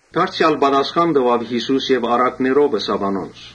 Դարձեալ Յիսուս առակներով ըսաւ անոնց.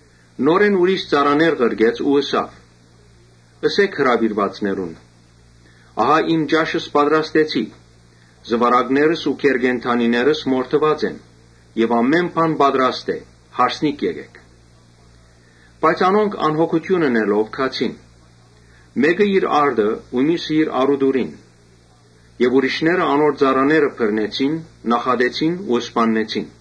Նորէն ուրիշ ծառաներ ղրկեց ու ըսաւ. «Ըսէք հրաւիրուածներուն, ‘Ահա իմ ճաշս պատրաստեցի, զուարակներս ու գէր կենդանիներս մորթուած են եւ ամէն բան պատրաստ է. հարսանիքի եկէք’»։ Բայց անոնք անհոգութիւն ընելով չեկան։ Մէկը իր արտը ու միւսը իր առուտուրին գնաց։ Ուրիշներ անոր ծառաները բռնեցին, նախատեցին ու սպաննեցին։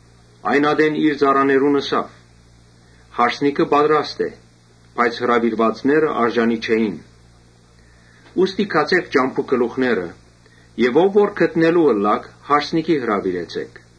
Այն ատեն իր ծառաներուն ըսաւ. «Հարսանիքը պատրաստ է, բայց հրաւիրուածները արժանի չէին։ Ուստի գացէք ճամբաներուն գլուխները եւ ո՛վ որ գտնելու ըլլաք, հարսանիքի հրաւիրեցէք»։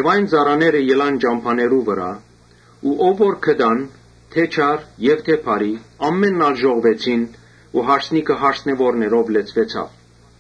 Այն ծառաները ելան ճամբաներուն վրայ ու ո՛վ որ գտան, թէ՛ չար եւ թէ բարի, ամէնքն ալ ժողվեցին ու հարսնետունը հրաւիրուածներով լեցուեցաւ։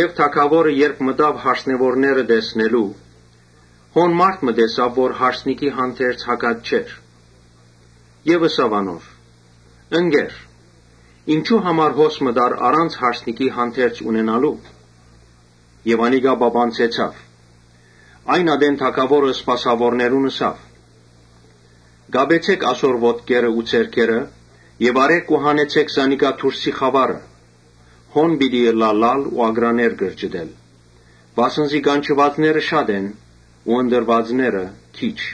Թագաւորը երբ մտաւ հարսնեւորները տեսնելու, մարդ մը տեսաւ, որ հարսանիքի հանդերձ հագած չէր, Ըսաւ անոր. «Ընկե՛ր, ինչո՞ւ համար հոս մտար առանց հարսանիքի հանդերձի»։ Անիկա պապանձեցաւ։ Այն ատեն թագաւորը սպասաւորներուն ըսաւ. «Կապեցէ՛ք ասոր ոտքերն ու ձեռքերը, հանեցէ՛ք զանիկա դուրսի խաւարը, հոն պիտի ըլլայ լալ ու ակռաներ կրճտել։ Վասն զի կանչուածները շատ են, բայց ընտրուածները քիչ»։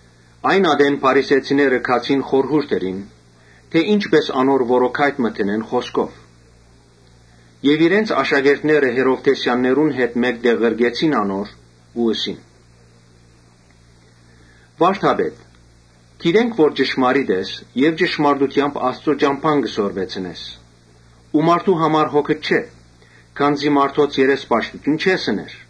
Այն ատեն փարիսեցիները խորհուրդ ըրին որպէս զի որոգայթ մը լարեն խօսքով։ Իրենց աշակերտները՝ Հերովդէսեաններու հետ մէկտեղ ղրկեցին անոր ու ըսին. «Վա՛րդապետ, գիտենք թէ ճշմարտախօս ես եւ ճշմարտութեամբ Աստուծոյ ճամբան կը սորվեցնես ու մարդո՛ւ համար հոգդ չէ, քանզի մարդոց երեսպաշտութիւն չես ըներ,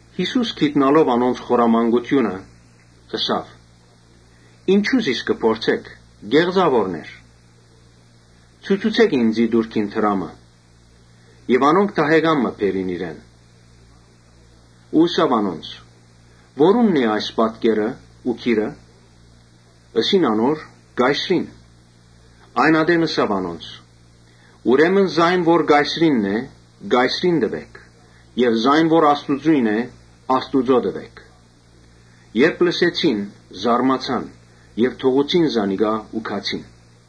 Յիսուս գիտնալով անոնց խորամանկութիւնը՝ ըսաւ. «Ինչո՞ւ զիս կը փորձէք, կե՛ղծաւորներ, Ցուցուցէք ինծի տուրքին դրամը»։ Անոնք դահեկան մը բերին իրեն։ Հարցուց անոնց. «Որո՞ւնն են այս պատկերն ու գիրը»։ Ըսին անոր. «Կայսրին»։ Այն ատեն ըսաւ անոնց. «Ուրեմն զայն որ Կայսրինն է՝ Կայսրին տուէք եւ զայն որ Աստուծոյն է՝ Աստուծոյ տուէք»։ Երբ լսեցին՝ զարմացան եւ թողուցին զանիկա ու գացին։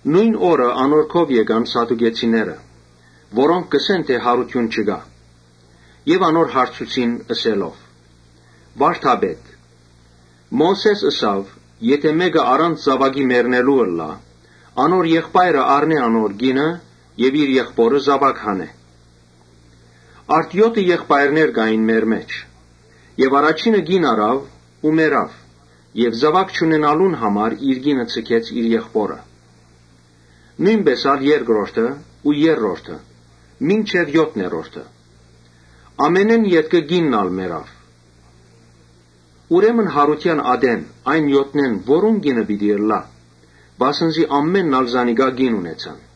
Նոյն օրը անոր քով եկան սադուկեցիներ, որոնք կ’ըսեն թէ յարութիւն չկայ եւ հարցուցին՝ Ըսելով. «Վա՛րդապետ, Մովսէս ըսաւ. ‘Եթէ մէկը առանց զաւակի մեռնելու ըլլայ, անոր եղբայրը առնէ անոր կինը եւ իր եղբօրը զաւակ տայ’։ Արդ եօթը եղբայրներ կային մեր մէջ։ Առաջինը կին առաւ ու մեռաւ։ Զաւակ չունենալուն համար իր կինը ձգեց իր եղբօրը։ Նոյնպէս ալ երկրորդը ու երրորդը՝ մինչեւ եօթներորդը։ Ամենէն ետքը կինն ալ մեռաւ։ Ուրեմն, յարութեան ատեն այն եօթնէն որո՞ւն կինը պիտի ըլլայ. վասն զի ամէնքն ալ զանիկա կին ունեցան»։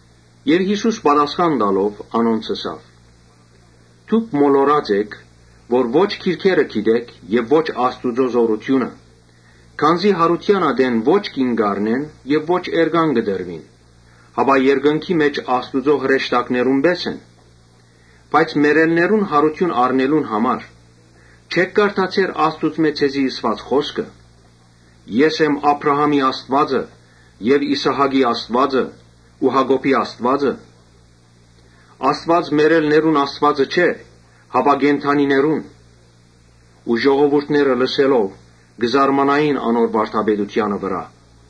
Յիսուս պատասխան տալով՝ անոնց ըսաւ. «Դուք մոլորած էք։ Ո՛չ գրքերը գիտէք եւ ո՛չ Աստուծոյ զօրութիւնը. Քանզի յարութեան ատեն ո՛չ կին կ’առնեն եւ ո՛չ էրկան կը տրուին, հապա երկնքի մէջ Աստուծոյ հրեշտակներուն պէս են։ Բայց մեռելներուն յարութիւն առնելուն համար՝ չէ՞ք կարդացեր Աստուծմէ ձեզի ըսուած խօսքը. ‘Ես եմ Աբրահամին Աստուածը եւ Իսահակին Աստուածը ու Յակոբին Աստուածը’։ Աստուած մեռելներուն Աստուածը չէ, հապա կենդանիներուն»։ Ժողովուրդը այս լսելով՝ կը զարմանային անոր վարդապետութեանը վրայ։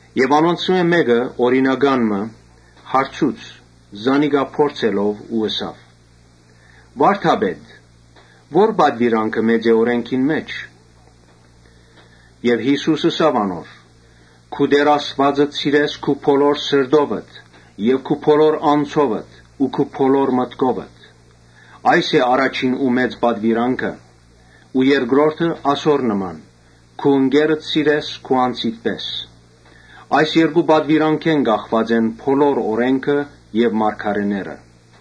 Եւ անոնցմէ օրինական մը հարցուց, զանիկա փորձելով. «Վա՛րդապետ, ո՞ր պատուիրանքը մեծ է օրէնքին մէջ»։ Յիսուս ըսաւ. «Քու Տէր Աստուածդ սիրես քու բոլոր սրտովդ եւ քու բոլոր անձովդ ու քու բոլոր մտքովդ։ Այս է առաջին ու մեծ պատուիրանքը։ Ու երկրորդը՝ ասոր նման. ‘Քու ընկերդ սիրես քու անձիդ պէս’։ Այս երկու պատուիրանքէն կախուած են բոլոր օրէնքը եւ մարգարէները»։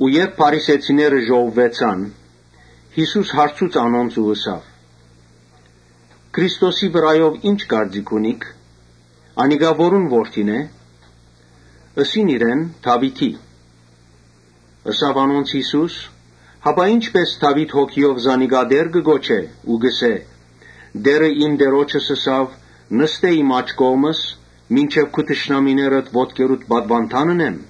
Երբ փարիսեցիները ժողվուեցան, Յիսուս հարցուց անոնց ու ըսաւ. «Քրիստոսի վրայով ի՞նչ կարծիք ունիք. անիկա որո՞ւն որդին է»։ Ըսին իրեն. «Դաւիթին»։ Ըսաւ անոնց Յիսուս. «Հապա ի՞նչպէս Դաւիթ Հոգիով զանիկա Տէր կը կոչէ ու կ’ըսէ. ‘Տէրը իմ Տէրոջս ըսաւ, Նստէ իմ աջ կողմս, մինչեւ քու թշնամիներդ ոտքերուդ պատուանդան ընեմ’։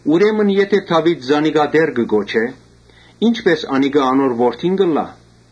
Ուրեմն եթէ Դաւիթ զանիկա Տէր կը կոչէ, ի՞նչպէս անիկա անոր որդին կ’ըլլայ»։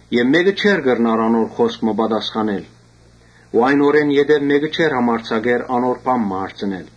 Եւ մէ՛կը չէր կրնար անոր պատասխանել։ Այն օրէն յետոյ մէ՛կը չէր համարձակեր անոր բան մը հարցնել։